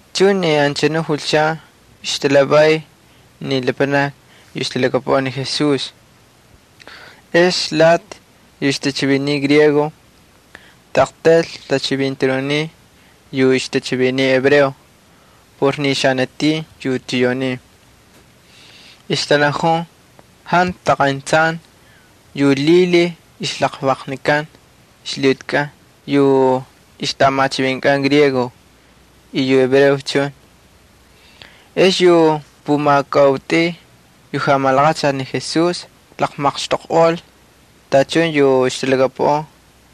Chuncha ni anchanu julchan ixtatalhavay ni lapanakni yu ixtalhakapuꞌan ni Jesús. Ex lati yu ixtachiviniy griego taꞌaqtaylcha tachivintanuniy yu ixtachiviniy hebreo por ni xanatin yu tiyaunin. Ixtanajun jantu qayntsay yu lhilhiy ixjalaqlvaqnikan ixlhiꞌutikꞌan yu ixtꞌamachivinkꞌan griego y yu hebreos chun. Ex yu pumakautꞌuy yu jamalaqachal ni Jesús tamaqxtoqꞌol tachun yu ixtalhakapuꞌan,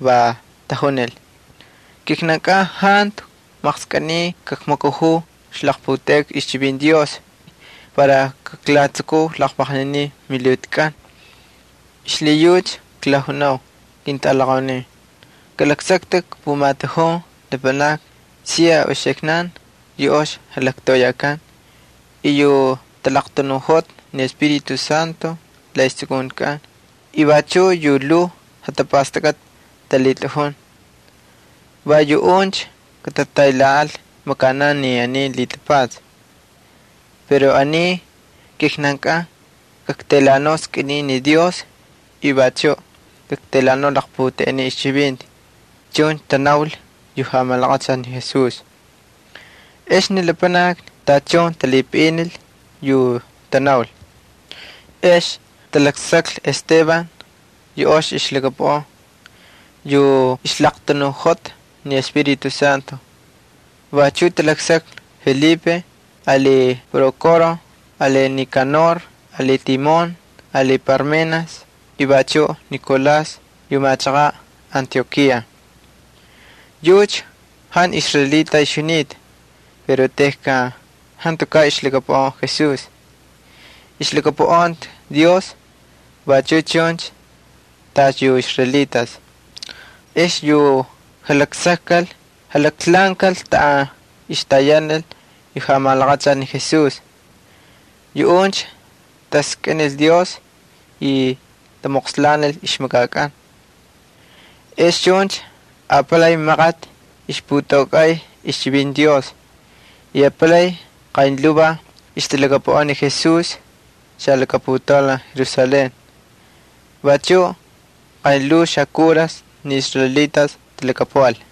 va tajunil: —Kijnan jantu maqskꞌiniy kakmakajuu ixlaqputeꞌeka ixchivinti Dios para kaklatsukuu laqlvaqninin milhiꞌutikꞌan. Xlhiyucha klajunau, ketꞌalaqaunin, kalaksaktꞌik pumatujun lapanakni siya uxiknan yu ox jalaktoꞌoyakan y yu talaqtanuꞌojota ni Espíritu Santo la ixjatsukuntikꞌan y vachuꞌ yu lhuu jatapastakꞌati talhitꞌajun. Va yuꞌuncha katataylhaꞌal makanan ni aniy lhitapatsa. Pero ni kijnankꞌan kaktaylhaꞌanau skꞌinin ni Dios y vachuꞌ kaktaylhaꞌanau laqputeꞌenin ixchivinti —chuncha tanaul yu jamalaqachal ni Jesús. Ex ni lapanakni tachun talhipaꞌinil yu tanaul. Ex talaksaklhi Esteban yu ox ixlhakapuꞌan, yu ixlaqtanuꞌojota ni Espíritu Santo. Vachuꞌ talaksaklhi Felipe, ali Prókoro, ali Nikanor, ali Timón, ali Parmenas y vachuꞌ Nicolás yu machaqaꞌ Antiokía. Yucha jantu israelita ixjunita pero tejkan jantukaꞌ ixlhakapuꞌan Jesús, ixlhakapuꞌanta Dios vachu chun tacha yu israelitas. Ex ni yu jalaksakkal jalaklhaꞌankal taꞌan ixtayanal yu jamalaqachal ni Jesús. Yuꞌuncha taskꞌinil Dios y tamoqslanil ixmakakꞌan. Ex chuncha apalay maqati ixputaukꞌay ixchivinti Dios y apalay qaynlhuu ixtalhakapuꞌan ni Jesús xalakaputaulan Jerusalén. Vachuꞌ qaynlhuvaj xakuras ni israelitas talhakapuꞌal.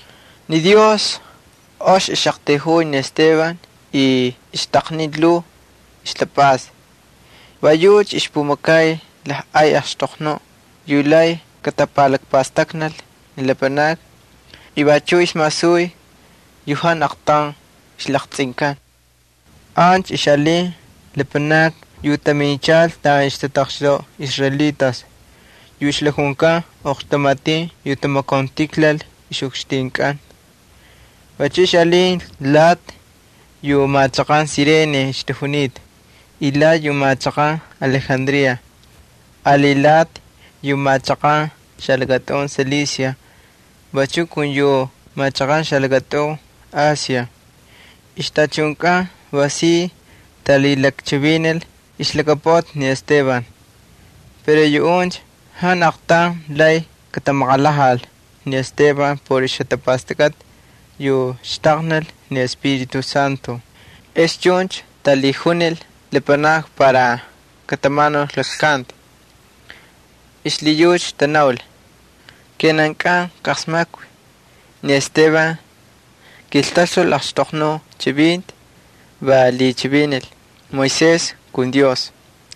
Ni Dios ox ixꞌaqtayjuy ni Esteban y ixtaqniy lhuu ixtapꞌasta. Va yucha ixpumakay lajꞌay axtoqnuꞌ yu lay katapalakpastaknal ni lapanakni y vachuꞌ ixmasuy yu jantu aqtaun ixlaqtsꞌinkan. Ancha ixꞌalin lapanakni yu taminchal taꞌan ixtataqxtoꞌa israelitas yu ixlakjunkan Oqxtamatin yu Tamakauntijlal Ixꞌukxtinkꞌan. Vachuꞌ ixꞌalin lati yu machaqan Cirene ixtajunita y lati yu machaqan Alejandría, ali lati yu machaqan xalakatꞌun Cilicia vachuꞌ kun yu machaqan xalakatꞌun Asia. Ixtachunkꞌan va si talhilakchivinil ixlhakapuꞌati ni Esteban. Pero yuꞌuncha jantu aqtaun lay katamaqalhajal ni Esteban por ixjatapastakꞌati yu ixtaqnil ni Espíritu Santo. Ex chuncha lakmapalkal lapanakni para katamanul jalaklkanti. Xlhiyucha tanaul: —Kijnan ijqalasmakvi ni Esteban kiltaxtul laqxtoqnu chivinti, va lhichivinil Moisés kun Dios.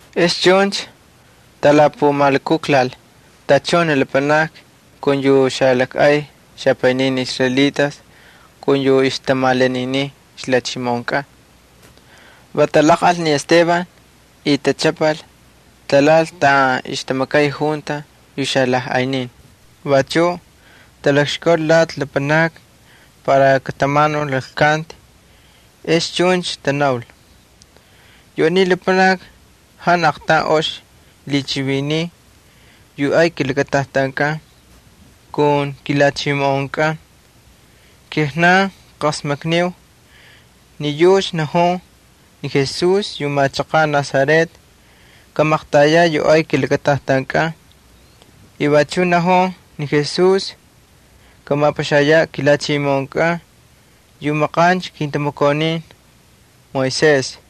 Ex chuncha talapumalukuklal tachun ni lapanakni kun yu xalakꞌay lapanakni israelitas kun yu ixtamalaninin ixlhachimoꞌonkꞌan. Va talaqꞌal ni Esteban y tachꞌapal, talhaꞌal taꞌan ixtamakay junta yu xalajꞌaynin. Vachuꞌ talakxkaul lati lapanakni para katamanul jalaklkanti, ex vachuꞌ tanaul: —Yu aniy lapanaki jantu aqtaun ox lhichiviniy yu ay kilakatajtankꞌan kun kilhachimoꞌonkꞌan. Kijnan klajqasmakniu ni yucha najun ni Jesús yu machaqaꞌ Nazaret kamaqtayaꞌ yu ay kilakatajtankꞌan. Vachuꞌ najun ni Jesús kamapaxayaꞌ kilhachimoꞌonkꞌan yu la maqancha kintamakaunin Moisés.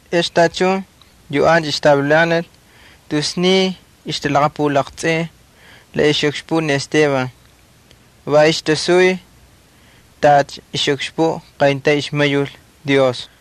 Ex tachun yu ancha ixtavilanal tus sniy ixtalaqapulaqtsꞌin la ixꞌukxpuꞌ ni Esteban, va ixtasuy tacha ixꞌukxpuꞌ qayntaun ixmayul Dios.